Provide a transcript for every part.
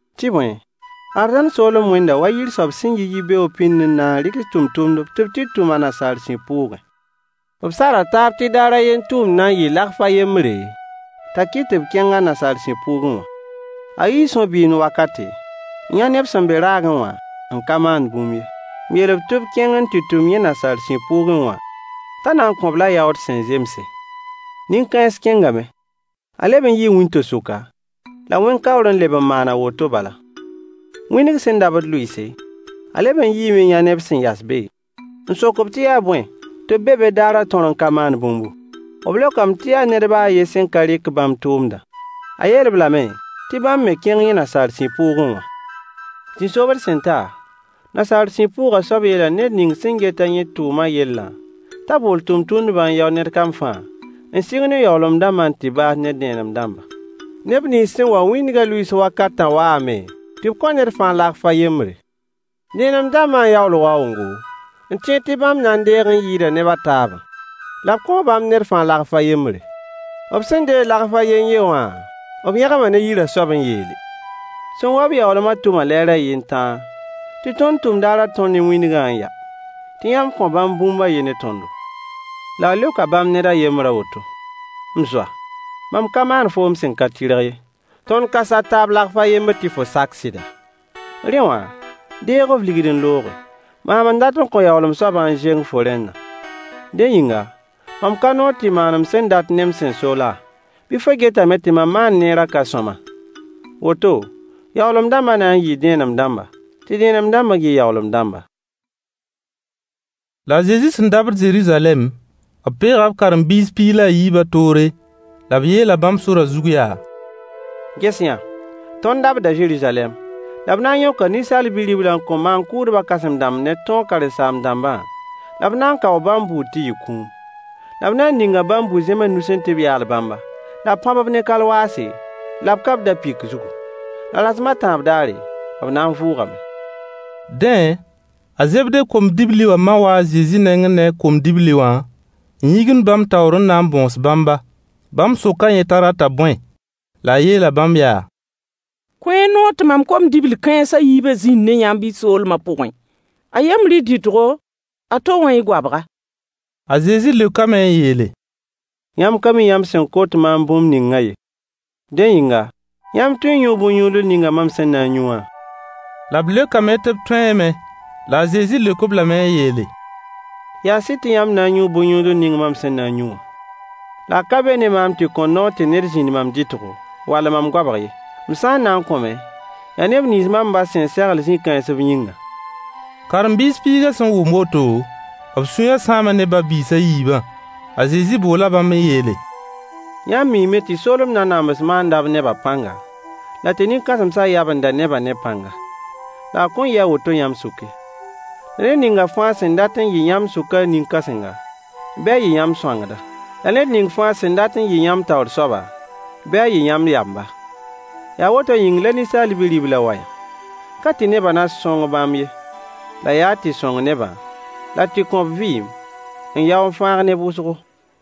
Tɩ bõe, arzãn soolem wẽnda wa yir soab sẽn yi yibeoog pĩnd n na n rɩgs tʋmtʋmdb tɩ b tɩ tʋm a nasaar sib pʋʋgẽ. B sara taab tɩ daar a yen tʋʋmd na n yɩɩ deniye a yembre, t'a kɩt tɩ b kẽng a nasaar sib pʋʋgẽ wã. A yii sõ-bɩɩmd wakate, n yã neb sẽn be raagẽ wã n ka maand bũmb ye, n yeel-b tɩ b kẽng n tɩ tʋm yẽ nasaar sib pʋʋgẽ wã, t'a na n kõ-b-la yaood sẽn zemse. Nin-kãens kẽngame. A leb n yii wĩnto-sʋka, la wẽn-kaoore n leb n maan a woto bala. Wĩndg sẽn dabd lʋɩɩse, a leb n yiime n yã neb sẽn yas be, n sok-b tɩ yaa bõe tɩ b be be daarã tõr n ka maand bũmbu? B leokame tɩ yaa ned ba a yen sẽn ka rɩk bãmb tʋʋmdã. A yeel-b lame tɩ bãmb me kẽng yẽ nasaar sib pʋʋgẽ wã. Zĩ-sobd sẽn ta, nasaar sib pʋʋgã soab yeela ned ning sẽn get-a yẽ tʋʋma yellã t'a bool tʋmtʋmdbã n yao ned kam fãa, n sɩng ne yaoolem dãmbã n tɩ baas ne dẽenem dãmbã. Neb nins sẽn wa wĩndgã lʋɩɩs wakatã waame tɩ b kõ ned fãa deniye a yembre. Dẽenem dãmbã n yaool waoongo, n tẽed tɩ bãmb na n deeg n yɩɩda neb a taabã. La b kõo bãmb ned fãa deniye a yembre. B sẽn deeg deniye a yen-yen wã, b yẽgma ne yirã soab n yeele: Sẽn wa-b yaoolmã tʋma lɛɛr a yen tãa, tɩ tõnd tʋm daarã tõr ne wĩndgã n ya, tɩ yãmb kõ bãmb bũmb a yen ne tõndo. La a leoka bãmb ned a yembr a woto: “M zoa, mam ka maan foom sẽn ka tɩrg ye. Tõnd ka sar taab deniye a yembr tɩ fo sak sɩda? Rẽ wã, deeg f ligd n looge. Maam n dat n kõ yaoolem soabã n zeng fo rẽndã. Dẽ yĩnga, mam ka noor tɩ maan m sẽn dat ne m sẽn so laa? Bɩ fo getame tɩ mam maan-neerã ka sõama?” Woto, yaoolem dãmbã na n yɩɩ dẽenem dãmba, tɩ dẽenem dãmbã yɩ yaoolem dãmba. La a Zezi sẽn dabd Zeruzalɛm, b peega b karen-biis piig la a yiibã toore, la b yeela bãmb sorã zug yaa: Ges-y-yã! Tõnd dabda Zeruzalɛm, la b na n yõka Ninsaal Bi-riblã n kõ maan-kʋʋdbã kãsem-dãmbã ne tõog karen-saam-dãmbã, la b na n kaoo bãmb bʋʋd tɩ yɩ kũum. La b na n ninga bãmb bu-zẽms nusẽ tɩ b yaal bãmba, la b pãb-b ne kalwaase, la b ka-b da-pɩk zugu. La rasem a tãab daare, b na n vʋʋgame. Dẽ, a Zebde kom-dibli wã ma waa a Zezi nengẽ ne a kom-dibli wã n yĩgimd bãmb taoor n na n bõos bãmba. Bãmb soka yẽ t'a rata bõe? La a yeela bãmb yaa: Kõ-y noor tɩ mam kom-dibl kãens a yiibã zĩnd ne yãmb y soolmã pʋgẽ, a yembr y dɩtgo, a to wã y goabga. A Zezi leokame n yeele: Yãmb ka mi yãmb sẽn kot maam bũmb ningã ye. Dẽ yĩnga, yãmb tõe n yũu bõn-yũudl ning mam sẽn na n yũ wã? La b leokame tɩ b tõeeme. La a Zezi leok-b lame n yeele: Yaa sɩd tɩ yãmb na n yũu bõn-yũudl ning mam sẽn na n yũ wã. La a ka be ne maam tɩ kõ noor tɩ ned zĩnd mam dɩtgo wall mam goabg ye. M sã n na n kõ me, yaa neb nins mam ba sẽn segl zĩ-kãens b yĩngã. Karen-biis piigã sẽn wʋm woto, b sũyã sãama ne ba-biis a yiibã. A Zezi boola bãmb n yeele: Yãmb miime tɩ soolem nanams maanda b nebã pãnga, la tɩ nin-kãsemsã yabenda nebã ne pãnga. La a kõn yɩ a woto yãmb sʋk ye. La ned ning fãa sẽn dat n yɩ yãmb sʋkã nin-kãsenga, bɩ a yɩ yãmb sõangda. La ned ning fãa sẽn dat n yɩ yãmb taoor soaba, bɩ a yɩ yãmb yamba. Yaa woto yĩng la Ninsaal Bi-riblã wayã. Ka tɩ nebã na sõng bãmb ye, la yaa tɩ sõng nebã, la tɩ kõ b vɩɩm, n yao n fãag neb wʋsgo.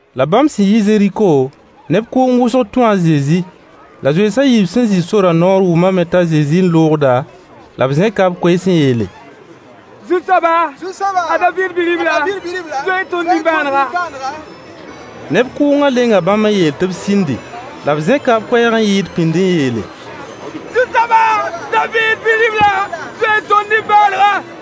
La bãmb sẽn yi Zeriko, neb kʋʋng wʋsg tũu a Zezi. La zoens a yiib sẽn zĩ sorã noor wʋmame t'a Zezi n loogda, la b zẽka b koees n yeele: Zu-soaba! A David Bi-ribla! Zoe-y tõnd nimbãanega. Neb kʋʋngã lenga bãmb n yeel-b tɩ b sĩndi. La b zẽka b koɛɛg n yɩɩd pĩnd n yeele: Zu-soaba! David Bi-ribla! Zoe-y tõnd nimbãanega.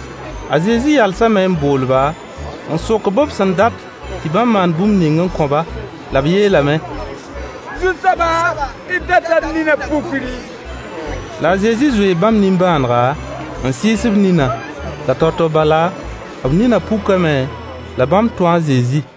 A Zezi yalsame n bool-ba, n sok-b b sẽn dat tɩ bãmb maan bũmb ning n kõ-ba. La b yeelame: Zu-soaba, d data d ninã pukri. La a Zezi zoee bãmb nimbãanega, n sɩɩs b ninã. La tao-tao bala b ninã pukame, la bãmb tũu a Zezi.